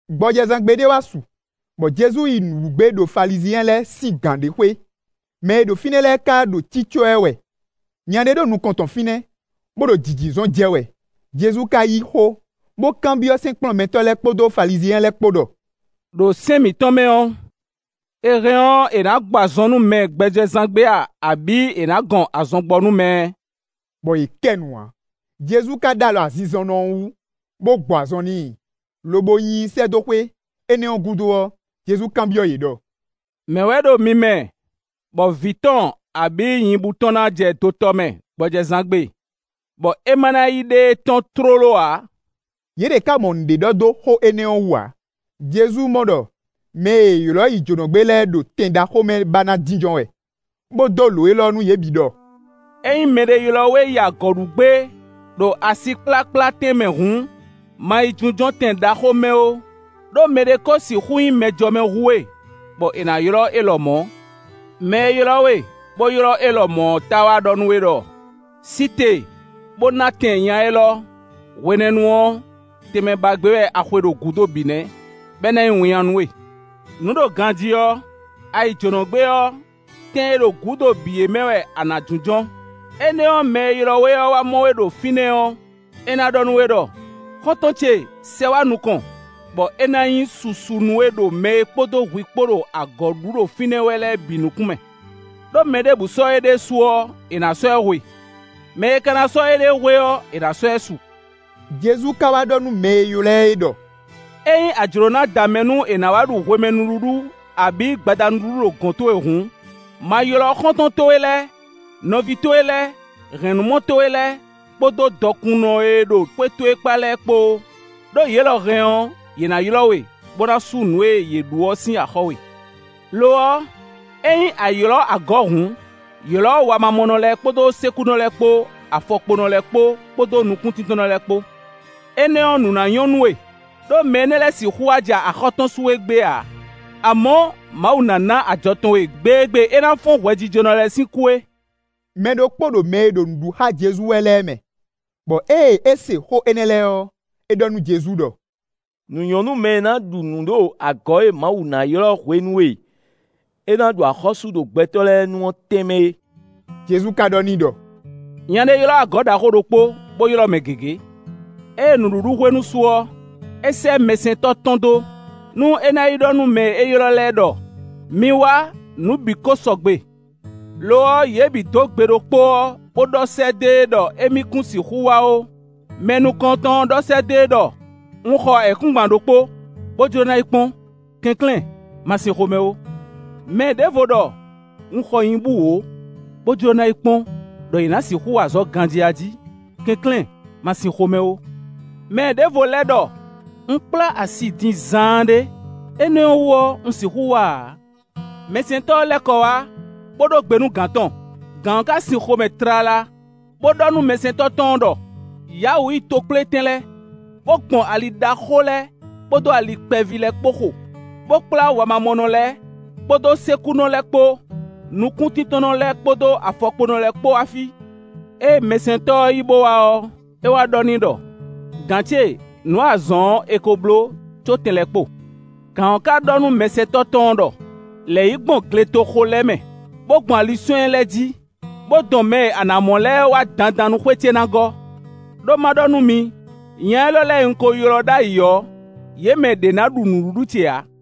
Gbɔjɛzán gbe ɖé wá su, bɔ Jezu yi nǔ ɖu gbé ɖo Falizyɛn lɛ́ɛ sín gǎn ɖé xwé; mɛ e ɖo fínɛ́ lɛ́ɛ ka ɖo cicɔ ɛ wɛ. Nya ɖé ɖo nukɔn tɔn fínɛ́, bó ɖo jǐjízɔn jɛ wɛ. Jezu ka yí xó, bó kanbyɔ́ sɛ́nkplɔ́nmɛtɔ́ lɛ́ɛ kpódó Falizyɛn lɛ́ɛ kpó ɖɔ: “Đo sɛ́n mǐtɔn mɛ ɔ́, è hɛn ɔ́, è nǎ gbɔ azɔn nú mɛ gbɔjɛzán gbe a, abǐ è nǎ gɔn azɔn gbɔ nú mɛ?” Bɔ yě kɛ nu ǎ. Jezu ka ɖó alɔ azinzɔnnɔ ɔ́ wú, bó gbɔ azɔn n'i, lobo nyi i sɛ́ dó xwé. Énɛ́ ɔ́ gúdo ɔ́, Jezu kanbyɔ́ yě ɖɔ: “Mɛ̌ wɛ ɖo mi mɛ bɔ vǐ tɔn abǐ nyibú tɔn ná jɛ dotɔ mɛ gbɔjɛzán gbe, bɔ é ma ná yi ɖe e tɔ́n tlóló ǎ?” Yě ɖě ká mɔ nǔɖé ɖɔ dó xó énɛ́ ɔ́ wú ǎ. Jezu mɔ ɖɔ mɛ e è ylɔ̌ yi jǒnɔgbé lɛ́ɛ ɖo tɛn ɖaxó mɛ ba ná jínjɔ́n wɛ, bó dó lǒ élɔ́ nú yě bǐ ɖɔ: “Ényí mɛɖé ylɔ́ we yi agɔ̌ ɖu gbé ɖo asikplákplá tɛnmɛ hǔn, ma yi jínjɔ́n tɛn ɖaxó mɛ ó, ɖó mɛɖé kó sixú nyí mɛjɔmɛ hú we, bɔ è nǎ ylɔ́ é lɔmɔ̌. Mɛ e ylɔ́ we, bó ylɔ́ é lɔmɔ̌ ɔ́ táá wá ɖɔ nú we ɖɔ: ‘Sí te, bó ná tɛn nya élɔ́’, hwenɛ́nu ɔ́, tɛnmɛ ba gbé wɛ a xwe ɖo gǔdo bǐ nɛ́, bɔ é ná nyí winnyá nú we. Nǔ ɖo ganjí ɔ́, a yi jǒnɔ gbé ɔ́, tɛn e ɖo gǔdo bǐ é mɛ wɛ a nǎ jínjɔ́n; énɛ́ ɔ́, mɛ e ylɔ́ we ɔ́ wá mɔ we ɖo fínɛ́ ɔ́, é ná ɖɔ nú we ɖɔ: ‘Xɔ́ntɔn ce, sɛ wá nukɔn’, bɔ é ná nyí susu nú we ɖo mɛ e kpódó hwi kpó ɖo agɔ̌ ɖu ɖo fínɛ́ wɛ lɛ́ɛ bǐ nukún mɛ. Đó mɛ ɖěbǔ sɔ́ éɖée su ɔ́, è nǎ sɔ́ ɛ hwe; mɛ e ka sɔ́ éɖée hwe ɔ́, è nǎ sɔ́ ɛ su.” Jezu ka wá ɖɔ nú mɛ e ylɔ́ ɛ é ɖɔ: “Ényí a jlǒ ná da mɛ nú è nǎ wá ɖu hwemɛ nǔɖuɖu, abǐ gbada nǔɖuɖu ɖo gɔ̌n towe hǔn, ma ylɔ́ xɔ́ntɔn towe lɛ́ɛ, nɔví towe lɛ́ɛ, hɛ̌nnumɔ towe lɛ́ɛ, kpódó dɔkunnɔ e ɖo xwé towe kpá lɛ́ɛ kpó ó; ɖó yě lɔ hɛn ɔ́, yě ná ylɔ́ we, bó ná sú nǔ e yě ɖu ɔ́ sín axɔ́ we. Lo ɔ́, ényí a ylɔ́ agɔ̌ hǔn, ylɔ̌ wamamɔnɔ lɛ́ɛ kpódó sékúnɔ lɛ́ɛ kpó, afɔkponɔ lɛ́ɛ kpódó nukúntíntɔ́nnɔ lɛ́ɛ kpó. Énɛ́ ɔ́, nǔ ná nyɔ́ nú we, ɖó mɛ énɛ́ lɛ́ɛ sixú wá ja axɔ́ tɔn sú we gbé ǎ; amɔ̌, Mawu ná ná ajɔ tɔn we gbe e gbe é ná fɔ́n hwɛjijɔnɔ lɛ́ɛ sín kú é.” Mɛ ɖokpó ɖo mɛ e ɖo nǔ ɖu xá Jezu wɛ lɛ́ɛ mɛ, bɔ ée é se xó énɛ́ lɛ́ɛ ɔ́, é ɖɔ nú Jezu ɖɔ: “Nǔ nyɔ́ nú mɛ e na ɖu nǔ ɖo agɔ̌ e Mawu na ylɔ́ hwenu e é ná ɖu axɔ́sú ɖo gbɛtɔ́ lɛ́ɛ nu ɔ́ tɛnmɛ é.” Jezu ka ɖɔ n'i ɖɔ: “Nya ɖé ylɔ́ agɔ̌ ɖaxó ɖokpó, bó ylɔ́ mɛ gěgé. Ée nǔɖuɖu hwenu su ɔ́, é sɛ́ mɛsɛntɔ́ tɔn dó, nú é ná yi ɖɔ nú mɛ e è ylɔ́ lɛ́ɛ ɖɔ: ‘Mi wá, nǔ bǐ ko sɔgbe.’ Lo ɔ́, yě bǐ dó gbe ɖokpó ɔ́, bó ɖɔ sɛ́ dó e ɖɔ émí kún sixú wá ó. Mɛ nukɔntɔn ɔ́ ɖɔ sɛ́ dó e ɖɔ: ‘Un xɔ ayǐkúngban ɖokpó, bó jló ná yi kpɔ́n; kɛnklɛ́n ma sin xomɛ ó.’ Mɛ ɖěvo ɖɔ: ‘Un xɔ nyibú wǒ, bó jló ná yi kpɔ́n ɖɔ yě ná sixú wa azɔ̌ ganjí a jí; kɛnklɛ́n ma sin xomɛ ó.’ Mɛ ɖěvo lɛ́ ɖɔ: ‘Un kplá asi din zaanɖé; énɛ́ ɔ́ wú ɔ́, un sixú wá ǎ.’ Mɛsɛntɔ́ ɔ́ lɛ́ kɔ wá, bó ɖó gbe nú gǎn tɔn. Gǎn ɔ́ ka sin xomɛ tlala, bó ɖɔ nú mɛsɛntɔ́ tɔn ɔ́ ɖɔ: ‘Ya wǔ yi tokplétɛn lɛ́ɛ, bó gbɔn ali ɖaxó lɛ́ɛ kpódó ali kpɛví lɛ́ɛ kpó xo, bó kplá wamamɔnɔ lɛ́ɛ kpódó sékúnɔ lɛ́ɛ kpó, nukúntíntɔ́nnɔ lɛ́ɛ kpódó afɔkponɔ lɛ́ɛ kpó wá fí.’ Ée mɛsɛntɔ́ ɔ́ yi bó wá ɔ́, é wá ɖɔ n'i ɖɔ: ‘Gǎn ce, nǔ e a zɔ̌n ɔ́, è ko bló, có tɛn lɛ́ kpo.’ Gǎn ɔ́ ka ɖɔ nú mɛsɛntɔ́ tɔn ɔ́ ɖɔ: ‘Lɛ̌ yi gbɔn gletoxo lɛ́ɛ mɛ, bó gbɔn aliswɛ́ɛ́n lɛ́ɛ jí, bó dɔn mɛ e a nǎ mɔ lɛ́ɛ wá dandan nú xwé ce ná gɔ́.’ Đó ma ɖɔ nú mi: nya énɛ́ lɛ́ɛ e un ko ylɔ́ ɖ'ayǐ ɔ́, yě mɛ ɖě ná ɖu nǔɖuɖu ce ǎ.”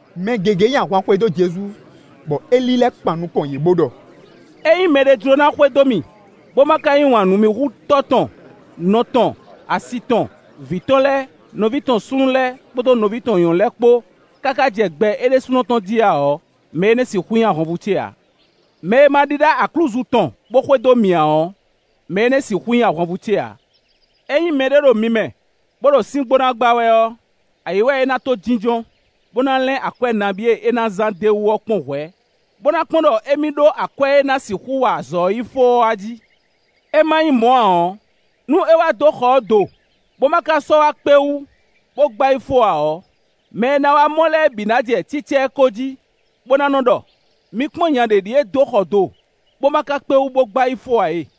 Mɛ gěgé nyi ahwan xwedó Jezu, bɔ é lílɛ́ kpan nukɔn yě, bó ɖɔ: “Ényí mɛɖé jló ná xwedó mì, bó má ka yí wǎn nú mì hú tɔ́ tɔn, nɔ tɔn, asi tɔn, vǐ tɔn lɛ́ɛ, nɔví tɔn súnnu lɛ́ɛ kpódó nɔví tɔn nyɔ̌nu lɛ́ɛ kpó, káká jɛ gbɛ é ɖésúnɔ tɔn jí ǎ ɔ́, mɛ énɛ́ sixú nyí ahwanvú ce ǎ. Mɛ e ma ɖíɖá aklúzu tɔn, bó xwedó mì ǎ ɔ́, mɛ énɛ́ sixú nyí ahwanvú ce ǎ. Ényí mɛɖé ɖo mi mɛ, bó ɖo síngbó ná gbá wɛ ɔ́, ayǐ wɛ é ná to jínjɔ́n, bó ná lɛ́n akwɛ́ nabí e é ná zán d'é wú ɔ́ kpɔ́n hwɛ̌, bó ná kpɔ́n ɖɔ émí ɖó akwɛ́ e ná sixú wa azɔ̌ ɔ́ yi fó ɔ́ a jí. É má nyí mɔ̌ ǎ ɔ́, nú é wá dó xɔ ɔ́ do, bó ma ka sɔ́ wá kpé wú, bó gbá yi fó ǎ ɔ́, mɛ e na wá mɔ lɛ́ɛ bǐ na jɛ cícá ɛ ko jí, bó ná nɔ́ ɖɔ: ‘Mi kpɔ́n, nya ɖě ɖíe dó xɔ do, bó ma ka kpé wú bó gbá yi fó ǎ e.’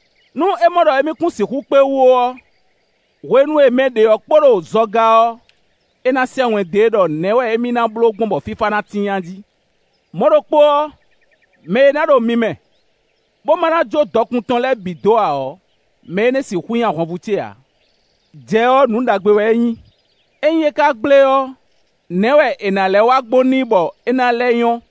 Nú é mɔ ɖɔ émí kún sixú kpé wú ó ɔ́, hwenu e mɛ ɖě ɔ́ kpo ɖo zɔga ɔ́, é ná sɛ́ wɛn dó e ɖɔ nɛ̌ wɛ émí ná bló gbɔn bɔ fífá ná tíin a jí. Mɔ̌ ɖokpó ɔ́, mɛ e ná ɖo mi mɛ, bó ma ná jó dɔkun tɔn lɛ́ɛ bǐ dó ǎ ɔ́, mɛ énɛ́ sixú nyí ahwanvú ce ǎ.” “Jɛ ɔ́, nǔ ɖagbe wɛ é nyí; ényí é ka gblé ɔ́, nɛ̌ wɛ è nǎ lɛ́ wa gbɔn n'i bɔ é ná lɛ́ nyɔ́?